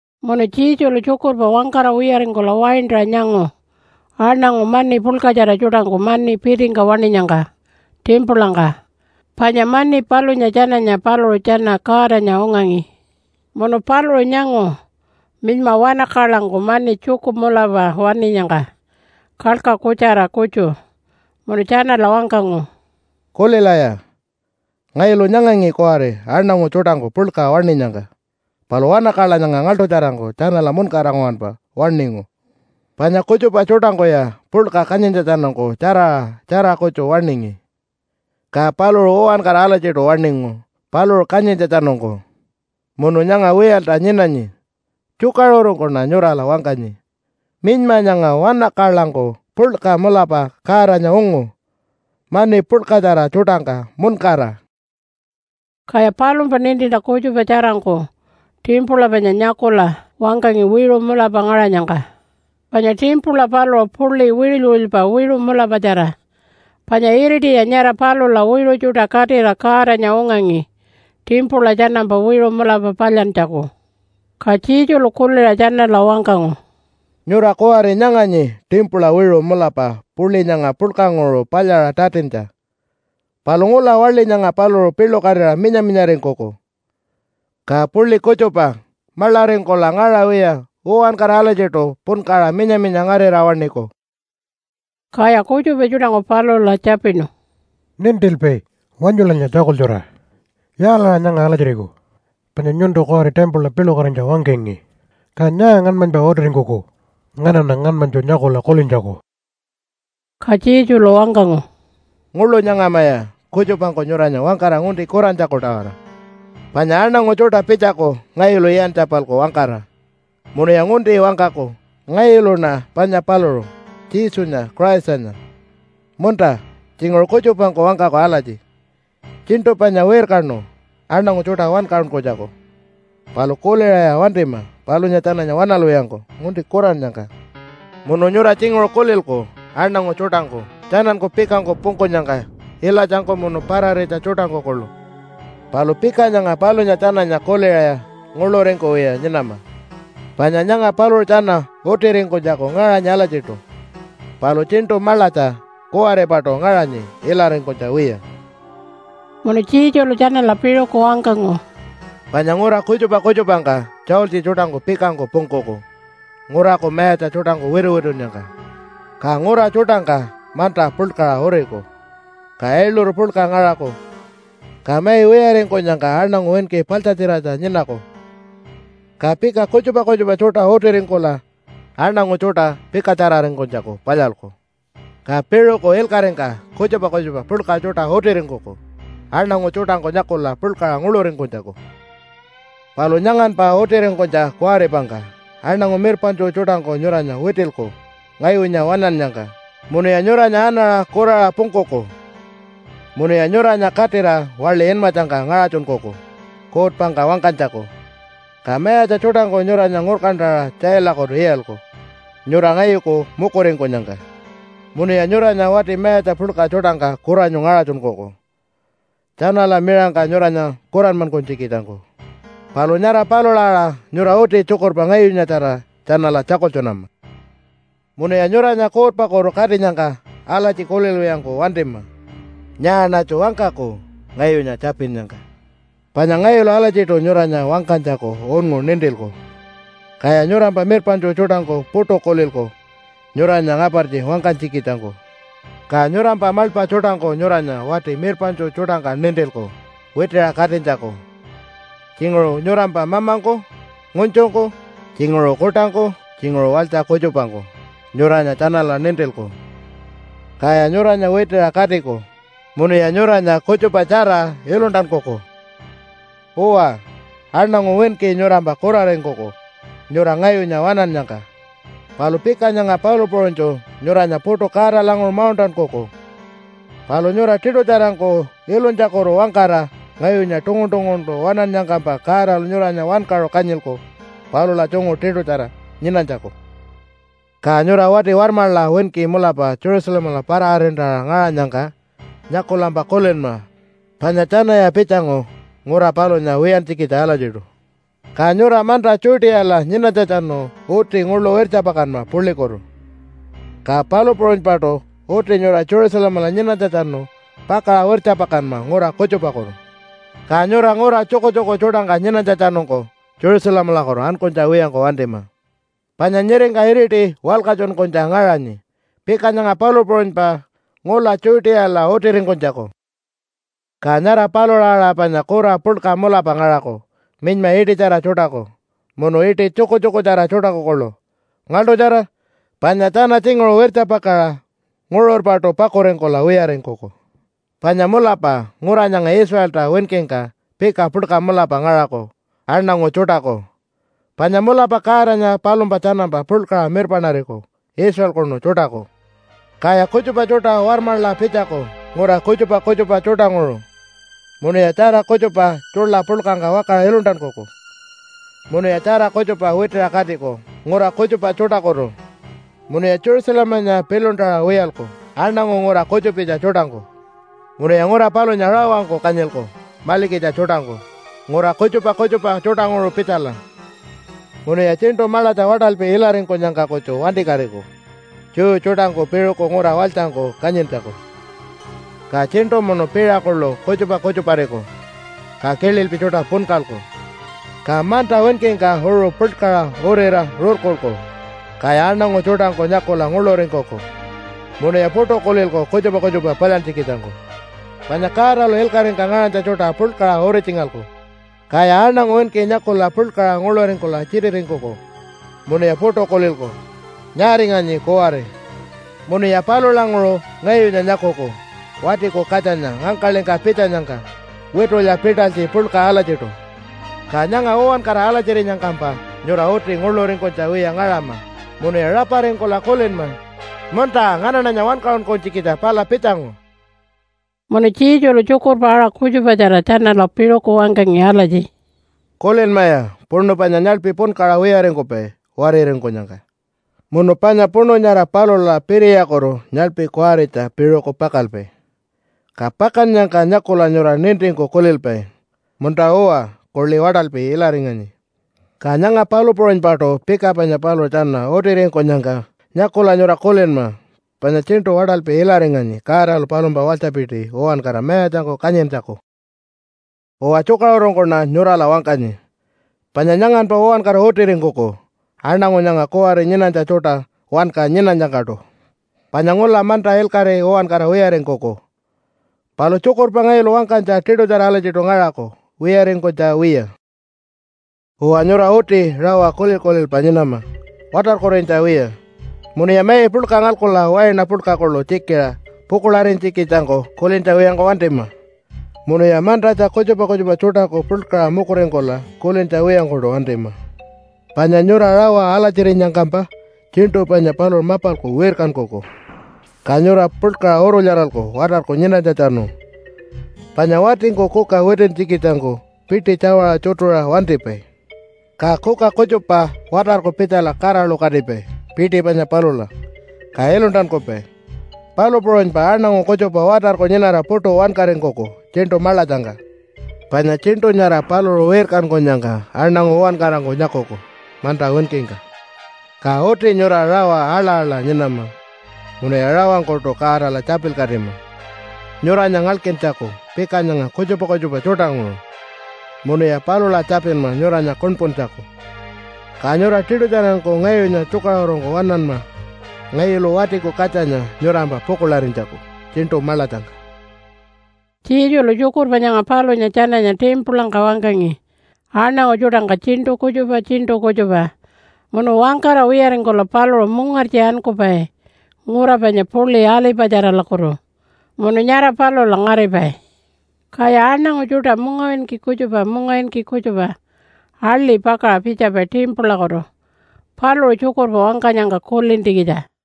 Munu Jesulu tjukurpa wangkara wiyaringkula waintaṟa nyangu aṉangu mani puḻkatjara tjuṯangku mani pitingka waṉinyangka timpulangka, panya mani palunya tjananya paluṟu tjana Godanya ungangi. Munu paluṟu nyangu minyma wanakaḻangku mani tjuku mulapa waṉinyangka kalka kutjara kutju munu tjanala wangkangu, “Kulilaya, ngayulu nyangangi kuwari aṉangu tjuṯangku puḻka waṉinyangka, palu wanakaḻa nyanga ngaḻṯutjarangku tjanala muṉkara nguwanpa waṉingu. Panya kutjupa tjuṯangkuya puḻka kanyintjatjanungku tjaraṟa tjara kutju waṉingi, ka paluṟu uwankara alatjiṯu waṉingu paluṟu kanyintjatjanungku, munu nyanga wiyalta nyinanyi. Tjukaṟurungkuṉa nyurala wangkanyi, minyma nyanga wanakaḻangku puḻka mulapa Godanya ungu mani puḻkatjara tjuṯangka muṉkara.” Kaya palumpa nintintja kutjupa tjarangku timpula panya nyakula wangkangi wiṟu mulapa ngaṟanyangka. Panya timpula paluṟu puḻi wiṟuly-wiṟulypa wiṟu mulapatjara. Panya iritiya nyara palula wiṟu tjuṯa katira Godanya ungangi timpula tjanampa wiṟu mulapa palyantjaku. Ka Jesulu kuliṟa tjanala wangkangu, “Nyura kuwari nyanganyi timpula wiṟu mulapa puḻi nyanga puḻkanguṟu palyaṟa tatintja. Palu ngula waḻi nyanga paluṟu piḻukatira minya-minyaringkuku. Ka puḻi kutjupa maḻaringkula ngaṟawiya uwankara alatjiṯu punkaṟa minya-minya ngarira waṉiku.” Kaya kutjupa tjuṯangku palula tjapinu, “Nintilpai, wanyulanya tjakultjura! Yaalaṟa nyanga alatjiriku panya nyuntu kuwari timpula piḻukatinytja wangkangi? Ka nyaa ngaṉmanypa utiringkuku nganaṉa ngaṉmanytju nyakula kulintjaku?” Ka Jesulu wangkangu, “Nguḻu nyangamaya kutjupangku nyuranya wangkara ngunti kurantjaku-tawara. Panya aṉangu tjuṯa pitjaku ngayulu iyantja-palku wangkara munuya ngunti wangkaku, ‘Ngayuluṉa panya paluṟu, Jesunya Christanya!’ Munta tjinguṟu kutjupangku wangkaku alatji, ‘Tjiṉṯu panya wirkanu, aṉangu tjuṯa wankaṟunkunytjaku.’ Palu kuliṟaya wantima palunya tjananya waṉalwiyangku ngunti kurannyangka. Munu nyura tjinguṟu kulilku aṉangu tjuṯangku tjananku pikangku pungkunyangka ilatjangku munu pararitja tjuṯangku kuḻu. Palu pika nyanga palunya tjananya kuliṟaya nguḻuringkuwiya nyinama, panya nyanga paluṟu tjana utiringkunytjaku ngaṟanyi alatjiṯu, palu tjiṉṯu maḻatja kuwaripaṯu ngaṟanyi ilaringkunytja wiya.” Munu Jesulu tjanala piṟuku wangkangu, “Panya ngura kutjupa kutjupangka tjaultji tjuṯangku pikangku pungkuku nguraku mayatja tjuṯangku wituwitunnyangka. Ka ngura tjuṯangka manta puḻkaṟa uriku. Ka ailuru puḻka ngaṟaku, ka mai wiyaringkunyangka aṉangu winki paḻtjatjiratja nyinaku, ka pika kutjupa kutjupa tjuṯa utiringkula aṉangu tjuṯa pikatjararingkunytjaku palyalku. Ka piṟuku ilkaṟingka kutjupa kutjupa puḻka tjuṯa utiringkuku aṉangu tjuṯangku nyakula puḻkaṟa nguḻuringkunytjaku. “Palu nyanganpa utiringkunytja kuwaripangka aṉangu mirpaṉtju tjuṯangku nyuranya witilku ngayunya waṉannyangka. Munuya nyuranya anaṟa kuraṟa pungkuku munuya nyuranya katira waḻi inmatjangka ngaṟatjunkuku kuutpangka wangkanytjaku, ka mayatja tjuṯangku nyuranya ngurkantaṟa tjailakutu iyalku, nyura ngayuku mukuringkunyangka. Munuya nyuranya wati mayatja puḻka tjuṯangka kuranyu ngaṟatjunkuku tjanala miṟangka nyuranya kuranmankunytjikitjangku. Palu nyara palula aṟa nyura uti tjukurpa ngayunyatjara tjanala tjakultjunama. “Munuya nyuranya kuutpakutu katinyangka alatji kulilwiyangku wantima, ‘Nyaaṉatju wangkaku ngayunya tjapinnyangka?’ Panya ngayulu alatjiṯu nyuranya wangkanytjaku unngu nintilku. Kaya nyurampa mirpaṉtju tjuṯangku puṯu kulilku nyuranya ngapartji wangkanytjikitjangku. Ka nyurampa maḻpa tjuṯangku nyuranya wati mirpaṉtju tjuṯangka nintilku witiṟa katinytjaku, tjinguṟu nyurampa mamangku ngunytjungku, tjinguṟu kuṯangku tjinguṟu walytja kutjupangku nyuranya tjanala nintilku, kaya nyuranya witiṟa katiku munuya nyuranya kutjupatjara iluntankuku. “Uwa, aṉangu winki nyurampa kuraringkuku nyura ngayunya waṉannyangka. Palu pika nyanga palu puṟunytju nyuranya puṯu Godalanguṟu mauṉṯankuku. Palu nyura tiṯutjarangku ilunytjakutu-wangkara ngayunya tungun-tunguntu waṉannyangkampa Godalu nyuranya wankaṟu kanyilku palula tjungu tiṯutjara nyinanytjaku. “Ka nyura wati warmaḻa winki mulapa Jerusalemala para-arintaṟa ngaṟanyangka nyakulampa kulinma panya tjanaya pitjangu ngura palunya wiyantjikitja alatjiṯu. Ka nyura manta Judeala nyinanytjatjanu uti nguḻu wirtjapakanma puḻikutu. Ka palu puṟunypaṯu uti nyura Jerusalemala nyinanytjatjanu pakaṟa wirtjapakanma ngura kutjupakutu. Ka nyura ngura tjukutjuku tjuṯangka nyinanytjatjanungku Jerusalemalakutu ankunytja wiyangku wantima. Panya nyiringka iriti walkatjunkunytja ngaṟanyi pika nyanga palu puṟunypa ngula Judeala utiringkunytjaku. “Ka nyara palula aṟa panya kura puḻka mulapa ngaṟaku minyma iṯitjara tjuṯaku munu iṯi tjukutjukutjara tjuṯaku kuḻu. Ngaḻṯutjara! Panya tjana tjinguṟu wirtjapakaṟa nguṟurpaṯu pakuringkula wiyaringkuku. Panya mulapa ngura nyanga Israelta winkingka pika puḻka mulapa ngaṟaku aṉangu tjuṯaku, panya mulapa Godanya palumpa tjanampa puḻkaṟa mirpaṉariku Israelkunu tjuṯaku. Kaya kutjupa tjuṯa warmaḻa pitjaku ngura kutjupa kutjupa tjuṯanguṟu munuya tjara kutjupa tjuḻa puḻkangka wakaṟa iluntankuku munuya tjara kutjupa witiṟa katiku ngura kutjupa tjuṯakutu. Munuya Jerusalemanya piḻuntaṟa wiyalku aṉangu ngura kutjupitja tjuṯangku. Munuya ngura palunya rawangku kanyilku maḻikitja tjuṯangku ngura kutjupa kutjupa tjuṯanguṟu pitjala. Munuya tjiṉṯu maḻatja waṯalpi ilaringkunyangka kutju wantikatiku Jew tjuṯangku piṟuku ngura walytjangku kanyintjaku. “Ka tjiṉṯu munu piṟa kuḻu kutjupa kutjuparikuku, ka kililpi tjuṯa punkalku. Ka manta winkingka uṟu puḻkaṟa urira rurkulku. Kaya aṉangu tjuṯangku nyakula nguḻuringkuku munuya puṯu kulilku kutjupa kutjupa palyantjikitjangku. Panya Godalu ilkaṟingka ngaṟanytja tjuṯa puḻkaṟa uritjingalku. Kaya aṉangu winki nyakula puḻkaṟa nguḻuringkula tjititingkuku munuya puṯu kulilku, ‘Nyaaringanyi kuwari?’ Munuya palulanguṟu ngayunya nyakuku Watiku Katjanya ngangkaḻingka pitjanyangka witulya pitalytji puḻka alatjiṯu. Ka nyanga uwankara alatjirinyangkampa nyura uti nguḻuringkunytja wiya ngaṟama munuya raparingkula kulinma, ‘Munta nganaṉanya wankaṟunkunytjikitja pala pitjangu.’” Munu Jesulu tjukurpa aṟa kutjupatjara tjanala piṟuku wangkangi alatji, “Kulinmaya puṉu panya nyaḻpi punkaṟa wiyaringkupai wariringkunyangka. Munu panya puṉu nyara palula piriyakutu nyaḻpi kuwaritja piṟuku pakalpai, ka pakannyangka nyakula nyura nintingku kulilpai, ‘Munta-uwa, kuḻi waṯalpi ilaringanyi.’ Ka nyanga palu puṟunypaṯu pika panya paluṟu tjana utiringkunyangka nyakula nyura kulinma panya tjiṉṯu waṯalpi ilaringanyi Godalu palumpa walytjapiti uwankara mayatjangku kanyintjaku. “Uwa, tjukaṟurungkuṉa nyurala wangkanyi, panya nyanganpa uwankara utiringkuku aṉangu nyanga kuwari nyinanytja tjuṯa wanka nyinanyangkaṯu. Panya ngula manta ilkaṟi uwankara wiyaringkuku, palu tjukurpa ngayulu wangkanytja tiṯutjara alatjiṯu ngaṟaku wiyaringkunytja wiya. “Uwa, nyura uti rawa kulil-kulilpa nyinama watarkurinytja wiya. Munuya mai puḻka ngalkula waina puḻka kuḻu tjikiṟa pukuḻarinytjikitjangku kulintja wiyangku wantima munuya mantatja kutjupa kutjupa tjuṯaku puḻkaṟa mukuringkula kulintja wiyangkuṯu wantima. Panya nyura rawa alatjirinyangkampa tjiṉṯu panya paluṟu mapalku wirkankuku, ka nyura puḻkaṟa urulyaralku watarku nyinanytjatjanu. Panya watingku kuka witintjikitjangku piṯi tjawaṟa tjutuṟa wantipai. Ka kuka kutjupa watarku pitjala kaṟalukatipai piṯi panya palula, ka iluntankupai. Palu puṟunypa aṉangu kutjupa watarku nyinara puṯu wankaringkuku tjiṉṯu maḻatjangka. Panya tjiṉṯu nyara paluṟu wirkankunyangka aṉangu uwankarangku nyakuku manta winkingka. Ka uti nyura rawa aḻa-aḻa nyinama munuya rawangkuṯu Godala tjapilkatima nyuranya ngalkintjaku pika nyanga kutjupa kutjupa tjuṯanguṟu. Munuya palula tjapinma nyuranya kuṉpuntjaku, ka nyura tiṯutjarangku ngayunya tjukaṟurungku waṉanma ngayulu Watiku Katjanya nyurampa pukuḻarinytjaku tjiṉṯu maḻatjangka.” Jesulu tjukurpa nyanga palunya tjananya timpulangka wangkangi aṉangu tjuṯangka tjiṉṯu kutjupa tjiṉṯu kutjupa, munu wangkara wiyaringkula paluṟu mungartji ankupai ngura panya puḻi Alipatjaralakutu munu nyara palula ngaripai. Kaya aṉangu tjuṯa mungawinki kutjupa mungawinki kutjupa ali pakaṟa pitjapai timpulakutu paluṟu tjukurpa wangkanyangka kulintjikitja.